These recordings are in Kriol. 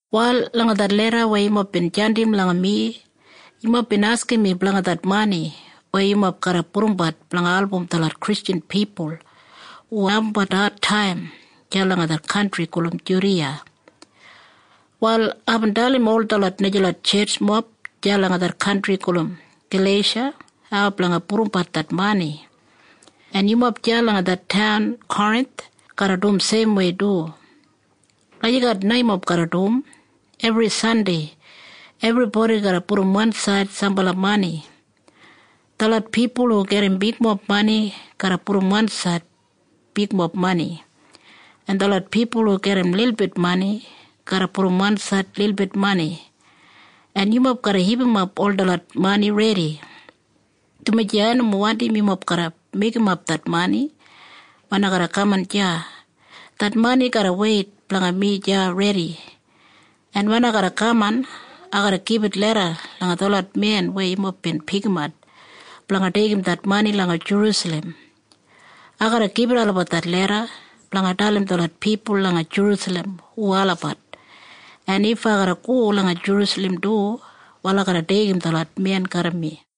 Wal langa det leda weya yumob bin jandim langa mi, yumob bin askim mi blanga det mani weya yumob garra pudumbat blanga album detlot Kristjan pipul hu abumbat adtaim deya langa det kantri gulum Judiya. Wal aibin dalim ol detlot najalot tjetjmob deya langa det kantri gulum Galeisha hau blanga pudumbat det mani, en yumob deya langa det taun Korinth garra dum seimwei du. Lagijat na yumob garra dum. Ebri Sandei ebribodi garra pudum wansaid sambala mani. Detlot pipul hu gedim bigmob mani garra pudum wansaid bigmob mani. En detlot pipul hu gedim lilbit mani garra pudum wansaid lilbit mani. En yumob garra hipimap ol detlot mani redi, dumaji ai nomo wandim yumob garra meigimap det mani wen ai garra kaman deya. Det mani garra weit blanga mi deya redi. En wen ai garra kaman, ai garra gibit leda langa detlot men weya yumob bin pikimat blanga deigim det mani langa Jerusalem. Ai garra gibit olabat det leda blanga dalim detlot pipul langa Jerusalem hu olabat. En if ai garra go langa Jerusalem du, wal ai garra deigim detlot men garram mi.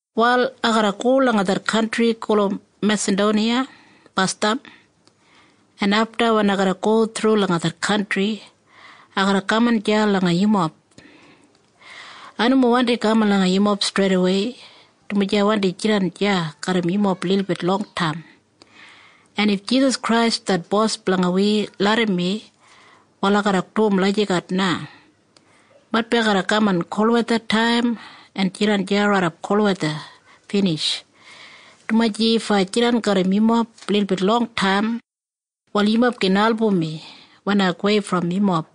Wal ai garra go langa det kantri gulum Mesadoniya basdam, en afta wen ai go thru langa det kantri, ai garra kaman deya langa yumob. Ai nomo wandi kaman langa yumob streidawei, dumaji ai wandi jidan deya garram yumob lilbit longtaim. En if Jisas Krais det Bos blanga wi larram mi, wal ai garra dum lagijat na. Maitbi ai garra kaman kolwethataim en jidan deya raidap kolwetha binij, dumaji if ai jidan garram yumob lilbit longtaim, wal yumob gin album mi wen ai gowei brom yumob.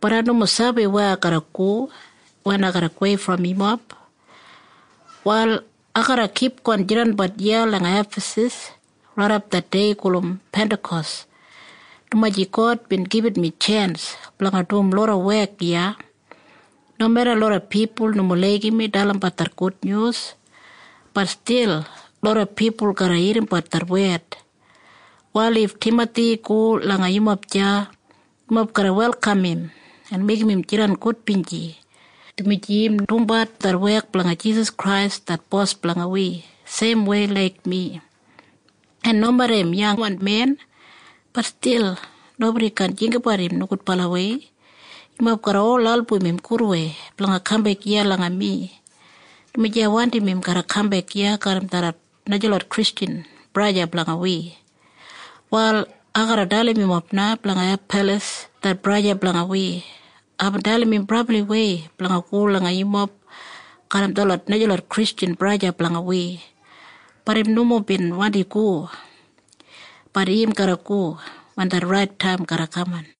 Bat ai nomo sabi weya ai garra go wen ai gowei brom yumob. Wal ai garra kipgon jidanbat iya langa Efasas raidap det dei gulum Pentakos, dumaji God bin gibit mi tjens blanga dum loda wek iya. Nomeda loda pipul nomo laigim mi dalimbat det gudnyus, bat stil loda pipul garra irrimbat det wed. Wal if Timathi go langa yumob deya, yumob garra welkam im en meigim im jidan gudbinji, dumaji im dumbat det wek blanga Jisas Krais det Bos blanga wi seimwei laik mi. En nomeda im yangwan men, bat stil nobodi kaan jinggabat im nogudbalawei. Yumob garra ol album im gudwei blanga kambek iya langa mi, dumaji ai wandim im garra kambek iya garram detlot najalot Kristjan braja en sista blanga wi. Wal ai garra dalim yumob na blanga Apalas det braja blanga wi. Aibin dalim im brabliwei blanga go langa yumob garram detlot najalot Kristjan braja en sista blanga wi. Bat im nomo bin wandi go. Bat im garra go wen det rait taim garra kaman.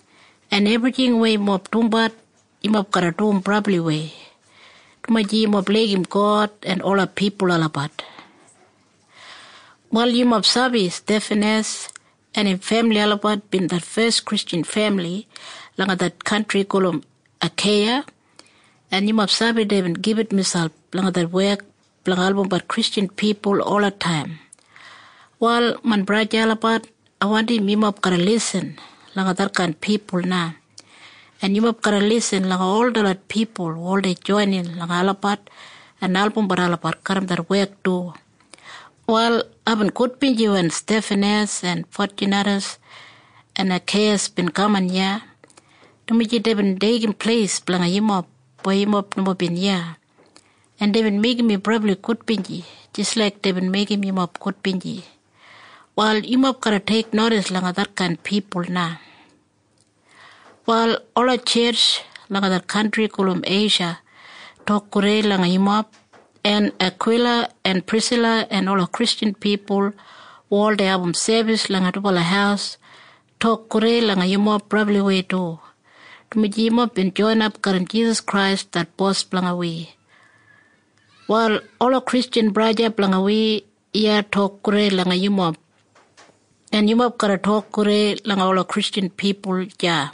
En ebrijing weya yumob dumbat, yumob garra dum brabliwei, dumaji yumob laigim God en ola pipul olabat. Wal yumob sabi Stefanas en im femili olabat bin det fes Kristjan femili langa det kantri gulum Akeiya, en yumob sabi deibin gibit miselp langa det wek blanga albumbat Kristjan pipul olataim. Wal main braja en sista olabat, ai wandim yumob garra lisin langa detkain pipul na. En yumob garra lisin langa ol detlot pipul hu oldei joinin langa olabat en albumbat olabat garram det wek du. Wal aibin gudbinji wen Stefanas en Fotjunadas en Akeikas bin kaman iya, dumaji deibin deigim pleis blanga yumob weya yumob nomo bin iya, en deibin meigim mi brabli gudbinji jis laik deibin meigim yumob gudbinji. Wal yumob garra teiknodis langa detkain pipul na. Wal ola tjetj langa det kantri gulum Eisha tok gudei langa yumob. En Akwila en Prisila en ola Kristjan pipul hu oldei abum sebis langa dubala haus tok gudei langa yumob brabliwei du, dumaji yumob bin joinap garram Jisas Krais det Bos blanga wi. Wal ola Kristjan braja en sista blanga wi iya tok gudei langa yumob. En yumob garra tok gudei langa ola Kristjan pipul deya.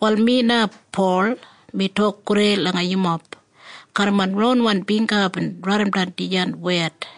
Wal mi na, Pol, mi tok gudei langa yumob. Garram main ronwan bingga aibin raidimdan dijan wed.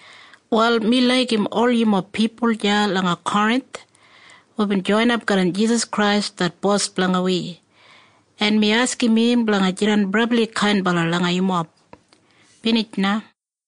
Wal mi laigim ol yumob pipul deya langa Korinth hubin joinap garram Jisas Krais det Bos blanga wi, en mi askim im blanga jidan brabli kainbala langa yumob. Binij na.